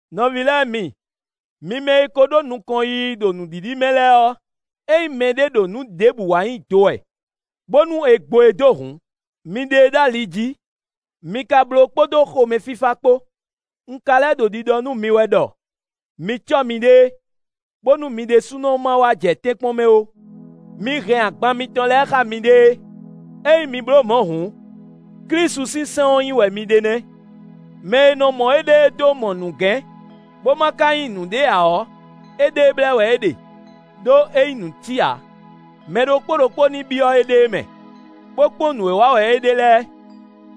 Nɔví lɛ́ɛ mi! Mi mɛ e ko ɖó nukɔn yiyi ɖo nǔɖiɖi mɛ lɛ́ɛ ɔ́, ényí mɛɖé ɖo nǔ ɖěbǔ wa nyi do wɛ, bónú è gbo e dó hǔn, mi ɖe e ɖó ali jí; mi ka bló kpódó xomɛfífá kpó. Un ka lɛ́ ɖo ɖiɖɔ nú mi wɛ ɖɔ mi cɔ́ miɖée, bónú mi ɖésúnɔ má wá jɛ tɛ́nkpɔ́n mɛ ó. Mi hɛn agban mitɔn lɛ́ɛ xá miɖée; ényí mi bló mɔ̌ hǔn, Klísu sín sɛ́n ɔ́ nyi wɛ mi ɖe nɛ́. Mɛ e nɔ mɔ éɖée dó mɔ nǔgɛ́n, bó má ka nyí nǔɖé ǎ ɔ́, éɖée blɛ́ wɛ é ɖe, ɖó é nyí nǔtí ǎ. Mɛ ɖokpó ɖokpó ní byɔ́ éɖée mɛ, bó kpɔ́n nǔ e wa wɛ é ɖe lɛ́ɛ;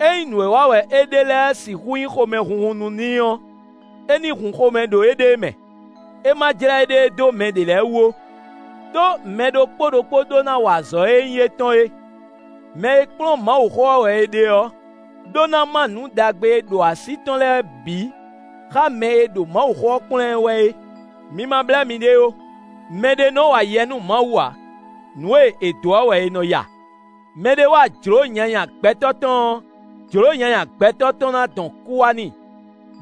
ényí nǔ e wa wɛ é ɖe lɛ́ɛ sixú nyí xomɛhunhun nú n'i ɔ́, é ní hun xomɛ ɖo éɖée mɛ; é má jlɛ́ éɖée dó mɛ ɖě lɛ́ɛ wú ó. Đó mɛ ɖokpó ɖokpó ɖó ná wa azɔ̌ e nyí étɔn é. Mɛ e kplɔ́n Mawuxó ɔ́ wɛ è ɖe ɔ́ ɖó ná má nǔ ɖagbe e ɖo así tɔn lɛ́ɛ bǐ xá mɛ e ɖo Mawuxó ɔ́ kplɔ́n ɛ wɛ é. Mi ma blɛ́ miɖée ó, mɛɖé nɔ wa yɛ nú Mawu ǎ. Nǔ e è dǒ ɔ́ wɛ è nɔ ya. Mɛ ɖé wa jlǒ nyanya gbɛtɔ́ tɔn ɔ́, jlǒ nyanya gbɛtɔ́ tɔn ná dɔn kú wá n'i;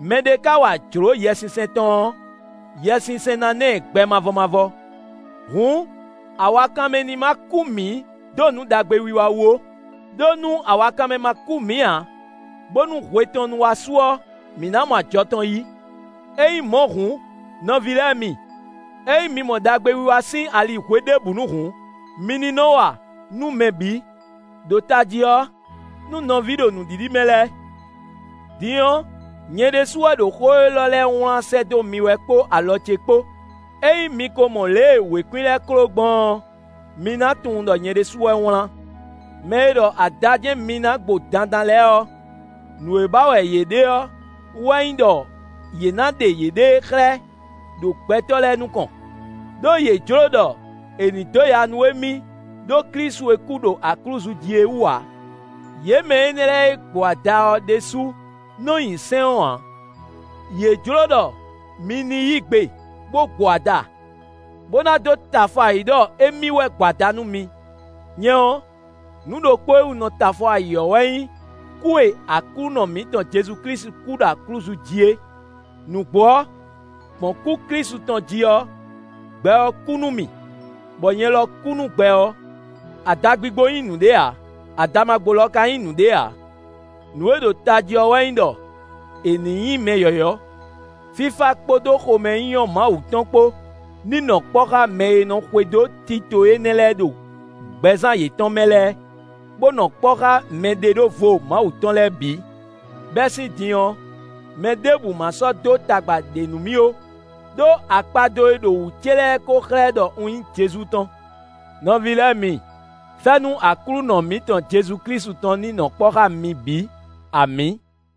mɛɖé ka wa jlǒ Yɛsinsɛn tɔn ɔ́, Yɛsinsɛn ná ná ɛ gbɛ mavɔ mavɔ. Hǔn awakanmɛ ní má kú mǐ dó nǔ ɖagbe wiwa wú ó. Đó nú awakanmɛ ma kú mǐ ǎ, bónú hwe tɔn nu wá su ɔ́, mǐ ná mɔ ajɔ tɔn yí. Ényí mɔ̌ hǔn nɔví lɛ́ɛ mi, ényí mǐ mɔ ɖagbewiwa sín ali hweɖěbǔnu hǔn, mǐ ní nɔ wa nú mɛ bǐ, ɖo tají ɔ́, nú nɔví ɖo nǔɖiɖi mɛ lɛ́ɛ. Din ɔ́, nyɛ ɖésú wɛ ɖo xó élɔ́ lɛ́ɛ wlán sɛ́ dó mi wɛ kpó alɔ ce kpó. Ényí mi ko mɔ lě e wěkwín lɛ́ɛ kló gbɔn ɔ́, mi ná tunwun ɖɔ nyɛ ɖésúnɔ wɛ wlán. Mɛ e ɖɔ ada jɛ́n mi ná gbo dandan lɛ́ɛ ɔ́, nǔ e ba wɛ yě ɖe ɔ́ wɛ nyí ɖɔ yě ná ɖe yěɖée xlɛ́ ɖo gbɛtɔ́ lɛ́ɛ nukɔn, ɖó yě jlǒ ɖɔ è ní dó ya nú émí ɖó Klísu e kú ɖo aklúzu jí é wú ǎ. Yě mɛ énɛ́ lɛ́ɛ e gbo ada ɔ́ ɖésú nɔ nyi sɛ́n ɔ́ ǎ. Yě jló ɖɔ mi ní yí gbe bó gbo ada, bó ná dó tɛ afɔ ayǐ ɖɔ émí wɛ gbo ada nú mi. Nyɛ ɔ́, nǔ ɖokpó e wú un nɔ tɛ afɔ ayǐ ɔ́ wɛ nyí kú e Aklúnɔ mǐtɔn Jezu Klísu kú ɖo aklúzu jí é. Nǔgbó ɔ́, gbɔn kú Klísu tɔn jí ɔ́, gbɛ ɔ́ kú nú mì, bɔ nyɛ lɔ kú nú gbɛ ɔ́. Adagbigbo nyí nǔɖé ǎ; adamagbo lɔ ka nyí nǔɖé ǎ; nǔ e ɖo tají ɔ́ wɛ nyí ɖɔ è ní nyí mɛ yɔ̌yɔ́. Fífá kpódó xomɛnyínyɔ́ Mawu tɔn kpó ní nɔ kpɔ́ xá mɛ e nɔ xwedó tito énɛ́ lɛ́ɛ ɖo gbɛzán yětɔn mɛ lɛ́ɛ, bó nɔ kpɔ́ xá mɛɖeɖóvo Mawu tɔn lɛ́ɛ bǐ. Bɛ́ sín din ɔ́, mɛ ɖěbǔ má sɔ́ dó tagba ɖě nú mì ó. Đó akpado e ɖo wǔ ce lɛ́ɛ ko xlɛ́ ɖɔ un nyí Jezu tɔn. Nɔví lɛ́ɛ mi! Fɛ́nú Aklúnɔ mǐtɔn Jezu Klísu tɔn ní nɔ kpɔ́ xá mi bǐ. Amǐ.